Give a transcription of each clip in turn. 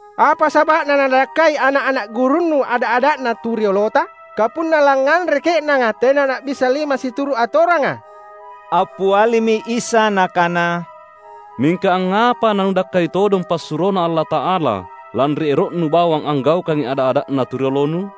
"Apa saba’na nanadakkai ana’-ana’ gurunNu ada’-ada’na tu riolota? Kapunna langnganre ke’nanga tena na’bissa lima situru’ atoranga!" Appialimi Isa Nakana, "Mingka angngapa nanudakkai todong passuroNa Allata’ala, lanri ero’nu bawang anggaukangi ada’-ada’na tu riolonu?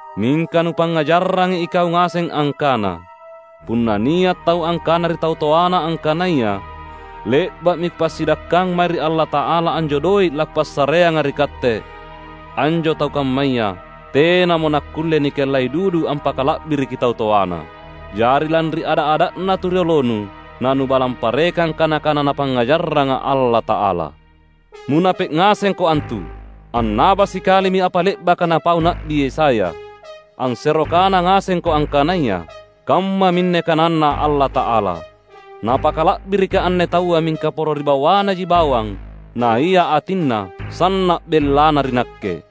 Mingka nupangngajarrangi ikau ngaseng angkana: punna nia’ tau angkana ri tau toana angkanaya, ‘Le’ba’mi kupassidakkang mae ri Allata’ala anjo doe’ lakupassareanga ri katte,’ anjo tau kammaya tenamo nakkulle nikellai dudu ampakala’biriki tau toana. Jari lanri ada’-ada’na tu riolonu nanubalang parekang kana-kana Napangngajarranga Allata’ala. Munape’ ngasengko antu! Annaba sikalimi apa le’baka napau Na’bi Yesaya, ansero kana ngasengko angkanaya: ‘Kammaminne kananNa Allata’ala: Napakala’birikKa’ anne taua mingka poro ri bawanaji bawang naia atinna sanna’ bellana ri Nakke.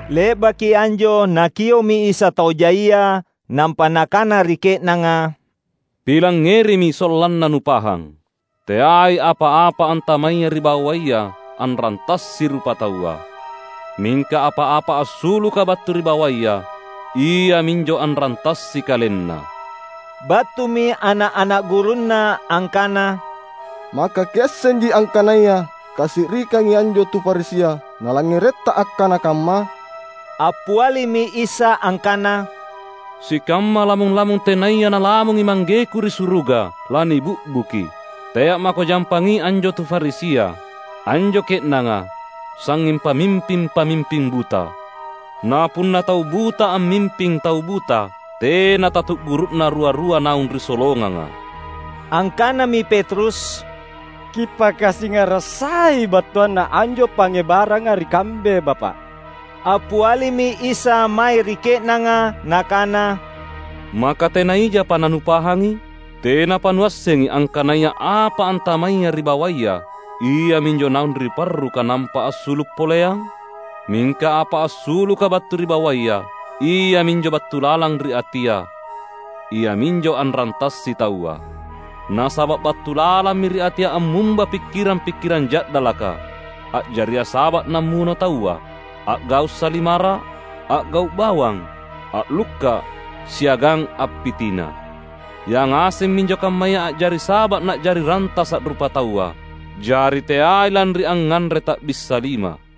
Le’baki anjo Nakio’mi Isa tau jaia nampa Nakana ri ke’nanga, "Pilangngerimi sollanna nupahang! Teai apa-apa antamaya ri bawaya anrantassi rupataua; mingka apa-apa assuluka battu ri bawaya, iaminjo anrantassi kalenna." Battumi ana’-ana’ gurunNa angkana, "Maka Kiassenji angkanaya kasi’rikangi anjo tu Farisia nalangngeretTa akkana kamma?" Appialimi Isa angkana, "Sikamma lamung-lamung tenaya Nalamungi Manggeku ri suruga lanibi’buki. Tea’ mako jampangi anjo tu Farisia. Anjo ke’nanga sangnging pamimping-pamimping buta. Na punna tau buta ammimping tau buta, tena tatu’guru’na rua-rua naung ri solonganga." Angkanami Petrus, "Kipakasingara’ sai battuanna anjo pangngebaranga ri kambe, Bapa’!" Appialimi Isa mae ri ke’nanga Nakana, "Maka tena ijapa nanupahangi? Tenapa nuassengi, angkanaya apa antamaya ri bawaya, iaminjo naung ri parruka nampa assulu’ poleang? Mingka apa assuluka battu ri bawaya, iaminjo battu lalang ri atia; iaminjo anrantassi taua. Nasaba’ battu lalammi ri atia ammumba pikkirang-pikkirang ja’dalaka, a’jaria saba’ nammuno taua, a’gau’ salimara’, a’gau’ bawang, a’lukka’, siagang appitina. Yangaseng minjo kammaya a’jari saba’ na’jari rantasa’ rupataua. Jari teai lanri angnganre ta’bissa lima."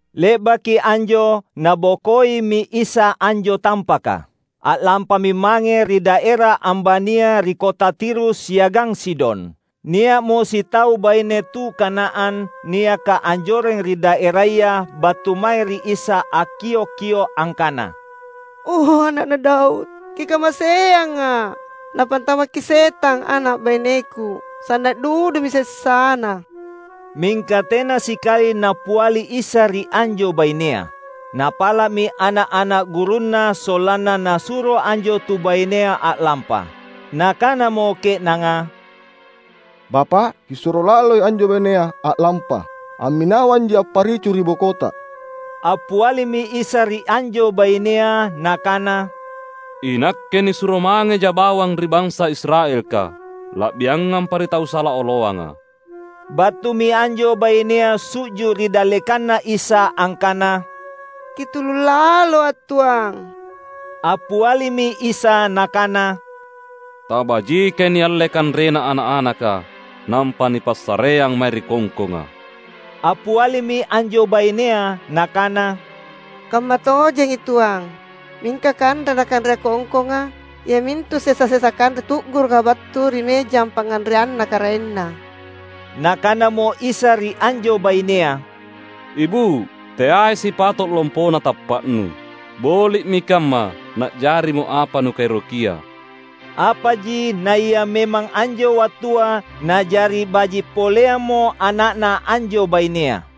Le’baki anjo, Nabokoimi Isa anjo tampaka. A’lampami mange ri daera ambania ri kota Tirus siagang Sidon. Nia’mo sitau baine tu Kanaan niaka anjoreng ri daeraya battu mae ri Isa akkiok-kio’ angkana, "O Ana’na Daud, Kikamaseanga’! Napantamakki setang ana’ baineku. Sanna’ dudumi sessana!" Mingka tena sikali Nappiali Isa ri anjo bainea. Napala’mi ana’-ana’ gurunNa sollanna Nasuro anjo tu bainea a’lampa. Nakanamo ke’nanga, "Bapa’ Kisuro laloi anjo bainea a’lampa. Amminawanji apparicu ri bokota!" Appialimi Isa ri anjo bainea, Nakana, "INakke nisuro mangejA’ bawang ri bansa Israelka, la’biangampa ri tau sala oloanga." Battumi anjo bainea su’ju’ ri dallekanNa Isa angkana, "Kitulullaloa’ tuang!" Appialimi Isa Nakana, "Tabajikai nialle kanrena ana’-anaka, nampa nipassareang mae ri kongkonga." Appialimi anjo bainea nakana, "Kammatojengi tuang, mingka kanre nakanrea kongkonga, iamintu sesa-sesa kanre tu’guruka battu ri mejang pangnganreanna karaenna." Nakanamo Isa ri anjo bainea: "Ibu’, teai sipato’ lompona tappa’nu. Boli’mi kamma na’jarimo apa nukaerokia!" Apaji naia memang anjo wattua na’jari baji’ poleammo ana’na anjo bainea.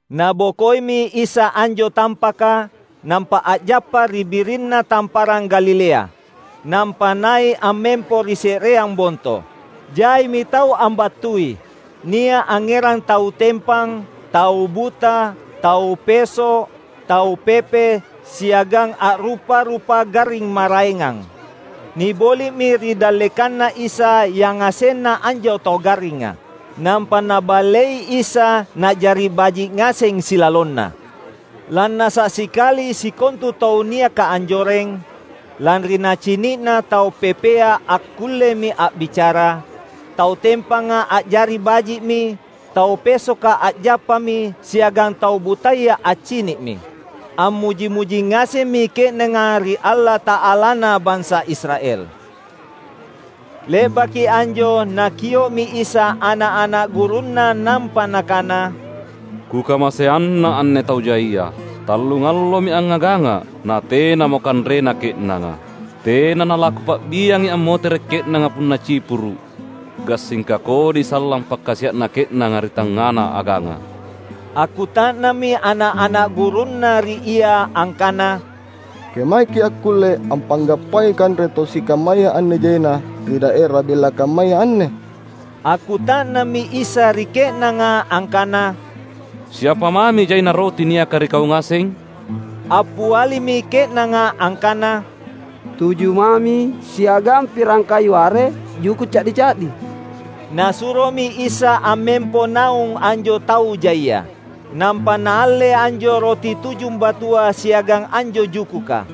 Nabokoimi Isa anjo tampaka, nampa a’jappa ri birinna Tamparang Galilea. Nampa nai’ ammempo ri se’reang bonto. Jaimi tau ambattui. Nia’ angngerang tau tempang, tau buta, tau peso’, tau pepe, siagang a’rupa-rupa garring maraengang. Niboli’mi ri dallekanNa Isa yangasenna anjo tau garringa. Nampa Naballei Isa na’jari baji’ ngaseng silalonna. Lannasa’ sikali sikontu tau niaka anjoreng, lanri nacini’na tau pepea akkullemi a’bicara, tau tempanga a’jari baji’mi, tau pesoka a’jappami, siagang tau butaya accini’mi. Ammuji-muji ngasemmi ke’nanga ri Allata’alana bansa Israel. Le’baki anjo Nakio’mi Isa ana’-ana’ gurunNa nampa Nakana, "Kukamaseanna anne tau jaia. Tallungallomi angngagangA’, natenamo kanrena ke’nanga. Tena nalaKupa’biangi ammotere’ ke’nanga punna cipuru’, gassingka kodi sallang pakkasia’na ke’nanga ri tangngana aganga!" Akkuta’nammi ana’-ana’ gurunNa ri Ia angkana, "Kemaeki’ akkulle ampanggappangi kanre tau sikammaya anne jaina ri daera bella kammaya anne?" Akkuta’nammi Isa ri ke’nanga angkana, "Siapa mami jaina roti niaka ri kau ngaseng?" Appialimi ke’nanga angkana, "Tuju mami, siagang pirang kayu are juku’ ca’di-ca’di." Nasuromi Isa ammempo naung anjo tau jaia. Nampa Naalle anjo roti tujumbatua siagang anjo jukuka.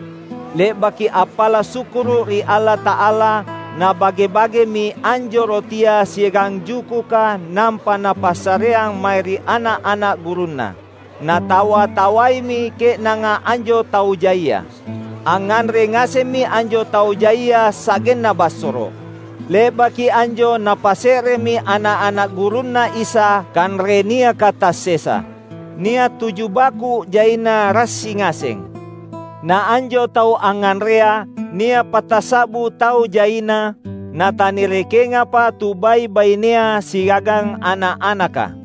Le’baki appala’ sukkuru’ ri Allata’ala, Nabage-bagemi anjo rotia siagang jukuka nampa Napassareang mae ri ana’-ana’ gurunNa. Natawa-tawaimi ke’nanga anjo tau jaia. Angnganre ngasemmi anjo tau jaia sa’genna bassoro’. Le’baki anjo napasse’remi ana’-ana’ gurunNa Isa kanre niaka tassesa. Nia’ tuju baku’ jaina rassi ngaseng. Na anjo tau angnganrea, nia’ patassa’bu tau jaina, natanirekengapa tu bai’-bainea siagang ana’-anaka.